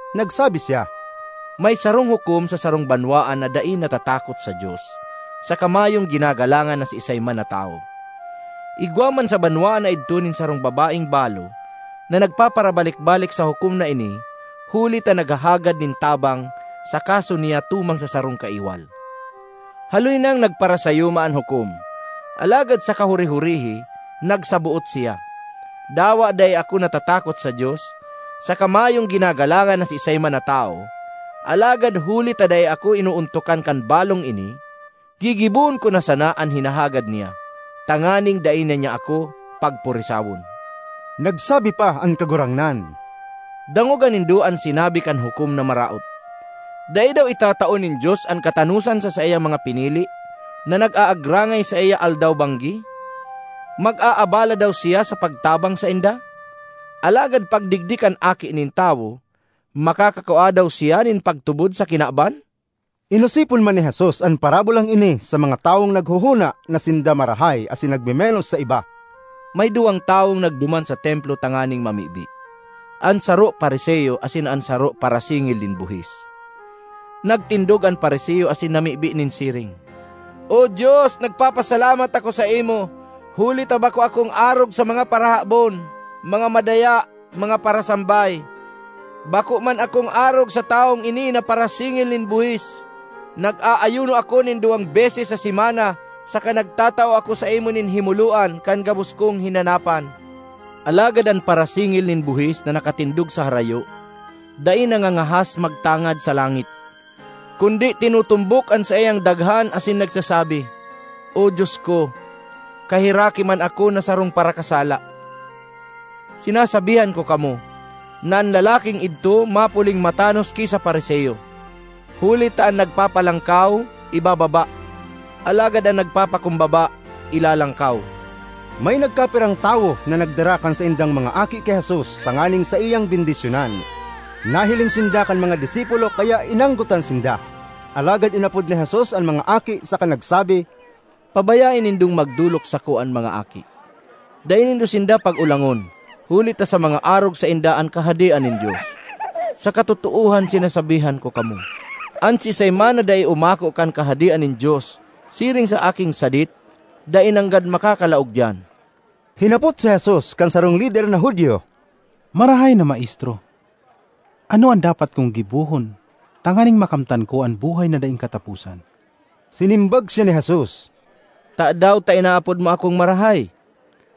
Nagsabi siya, “May sarong hukom sa sarong banwaan na dai natatakot sa Dios saka mayong ginagalangan na siisay man na tawo. Igwa man sa banwaan na idto nin sarong babaeng balo na nagpaparabalik-balik sa hukom na ini huli ta naghahagad nin tabang sa kaso niya tumang sa sarong kaiwal. Haloy nang nagparasayuma an hukom, alagad sa kahuri-hurihi nagsaboot siya, ‘Dawa dai ako natatakot sa Dios, saka mayong ginagalangan na siisay man na tawo, alagad huli ta dai ako inoontokan kan balong ini, gigibohon ko na sana an hinahagad niya, tanganing dai na niya ako pagpurisawon.’” Nagsabi pa an Kagurangnan, “Dangoga nindo an sinabi kan hukom na maraot. Dai daw itatao nin Dios an katanosan sa saiyang mga pinili na nag-aagrangay saiya aldaw-banggi? Mag-aabala daw siya sa pagtabang sainda? Alagad pagdigdi kan Aki nin Tawo, makakakua daw siya nin pagtubod sa kinaban?” Inosipon man ni Jesus an parabolang ini sa mga tawong naghohona na sinda marahay asin nagmemenos sa iba: ”May duwang tawong nagduman sa Templo tanganing mamibi; an saro Fariseo asin an saro parasingil nin buhis. ”Nagtindog an Fariseo asin namibi nin siring, ‘O Dios, nagpapasalamat ako saimo, huli ta bako ako arog sa mga parahabon, mga madaya, mga parasambay. Bako man ako arog sa tawong ini na parasingil nin buhis. Nag-aayuno ako nin duwang beses sa semana saka nagtatao ako saimo nin himoloan kan gabos kong hinanapan.’ Alagad an parasingil nin buhis na nakatindog sa harayo, dai nangangahas magtangad sa langit, kundi tinutumbok an saiyang daghan asin nagsasabi, ‘O Dios ko, kaheraki man ako na sarong parakasala!’ Sinasabihan ko kamo na an lalaking idto mapuling matanos ki sa Fariseo. Huli ta an nagpapalangkaw, ibababa; alagad an nagpapakumbaba, ilalangkaw.” May nagkapirang tawo na nagdara kan saindang mga aki ki Jesus tanganing saiyang bendisyonan.z Nahiling sinda kan mga disipulo kaya inanggotan sinda. Alagad inapod ni Jesus an mga aki saka nagsabi, “Pabayae nindong magdolok sako an mga aki! Dai nindo sinda pag-olangon huli ta sa mga arog sainda an Kahadean nin Dios. Sa katotoohan sinasabihan ko kamo, an siisay man na dai umako kan Kahadean nin Dios siring sa aking sadit, dai nanggad makakalaog diyan.” Hinapot si Jesus kan sarong lider na Judio, “Marahay na Maestro, ano an dapat kong gibohon tanganing makamtan ko an buhay na daing kataposan?” Sinimbag siya ni Jesus, “Tadaw ta inaapod mo akong marahay?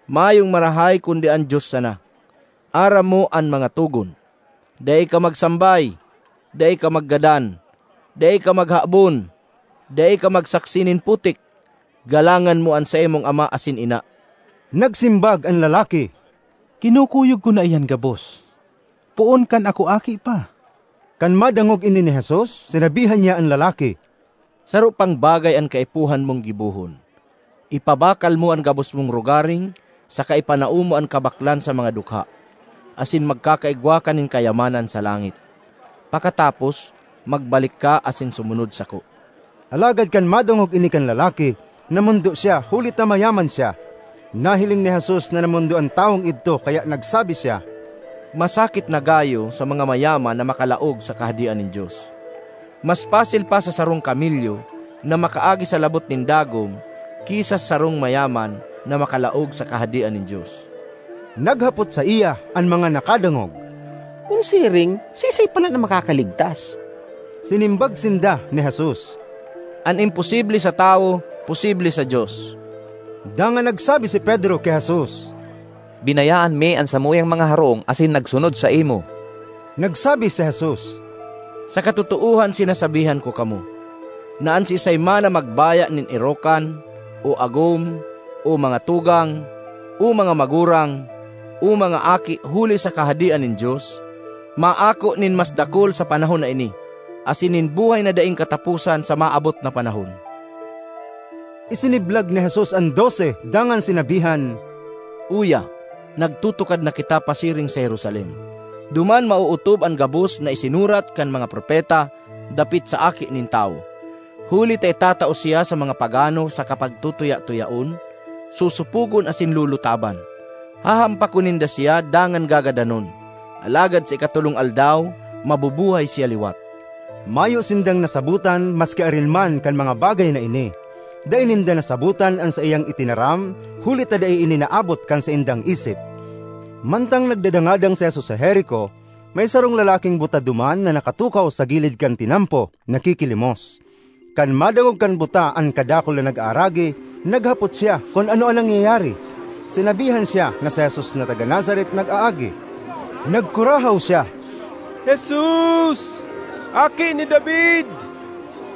Mayong marahay kundi an Dios sana. Aram mo an mga togon: ‘Dai ka magsambay; dai ka maggadan; dai ka maghabon; dai ka magsaksi nin putik; galangan mo an saimong ama asin ina.’” Nagsimbag an lalaki, “Kinukuyog ko na iyan gabos poon kan ako aki pa.” Kan madangog ini ni Jesus, sinabihan niya an lalaki, “Saro pang bagay an kaipuhan mong gibohon. Ipabakal mo an gabos mong rogaring saka ipanao mo an kabaklan sa mga dukha, asin magkakaigwa ka nin kayamanan sa langit. Pakatapos, magbalik ka asin sumunod sako.” Alagad kan madangog ini kan lalaki, namondo siya huli ta mayaman siya. Nahiling ni Jesus na namondo an tawong idto kaya nagsabi siya, “Masakit na gayo sa mga mayaman na makalaog sa Kahadean nin Dios! Mas pasil pa sa sarong kamelyo na makaagi sa labot nin dagom ki sa sarong mayaman na makalaog sa Kahadean nin Dios.” Naghapot saiya an mga nakadangog, “Kun siring, siisay palan an makakaligtas?” Sinimbag sinda ni Jesus, “An imposible sa tawo, posible sa Dios.” Dangan nagsabi si Pedro ki Jesus, “Binayaan mi an samuyang mga harong asin nagsunod saimo.” Nagsabi si Jesus, “Sa katotoohan sinasabihan ko kamo, na an siisay man na magbaya nin erokan, o agom, o mga tugang, o mga magurang o mga aki huli sa Kahadean nin Dios, maako nin mas dakul sa panahon na ini, asin nin buhay na daing kataposan sa maabot na panahon.” Isiniblag ni Jesus an Dose dangan sinabihan, “Uya, nagtutukad na kita pasiring sa Jerusalem; duman maootob an gabos na isinurat kan mga propeta dapit sa Aki nin Tawo. Huli ta itatao siya sa mga pagano saka pagtutuya-tuyaon, sosopogon asin lulutaban. Hahampakon ninda siya dangan gagadanon, alagad sa ikatolong aldaw mabubuhay siya liwat.” Mayo sindang nasabotan maski arin man kan mga bagay na ini; dai ninda nasabotan an saiyang itinaram huli ta dai ini naabot kan saindang isip! Mantang nagdadangadang si Jesus sa Jerico, may sarong lalaking buta duman na nakatukaw sa gilid kan tinampo, nakikilimos. Kan madangog kan buta an kadakul na nag-aaragi, naghapot siya kun ano an nangyayari. Sinabihan siya na si Jesus na taga Nazaret nag-aagi. Nagkurahaw siya, “Jesus! Aki ni David!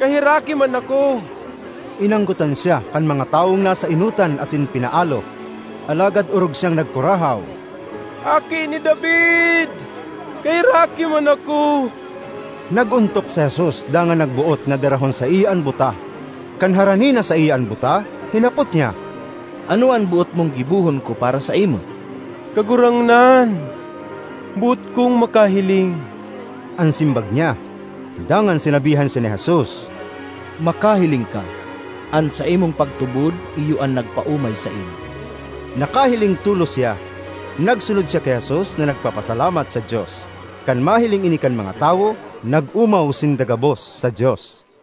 Kaheraki man ako!” Inanggotan siya kan mga tawong nasa enotan asin pinaalo. Alagad orog siyang nagkurahaw, “Aki ni David! Kaheraki man ako!” Nag-ontok si Jesus, dangan nagboot na darahon saiya an buta. Kan harani na saiya an buta, hinapot niya, ”Ano an boot mong gibohon ko para saimo?” “Kagurangnan, boot kong makahiling,” an simbag niya. Dangan sinabihan siya ni Jesus, “Makahiling ka! An saimong pagtubod iyo an nagpaomay saimo.” Nakahiling tolos siya; nagsunod siya ki Jesus na nagpapasalamat sa Dios. Kan mahiling ini kan mga tawo, nag-omaw sinda gabos sa Dios.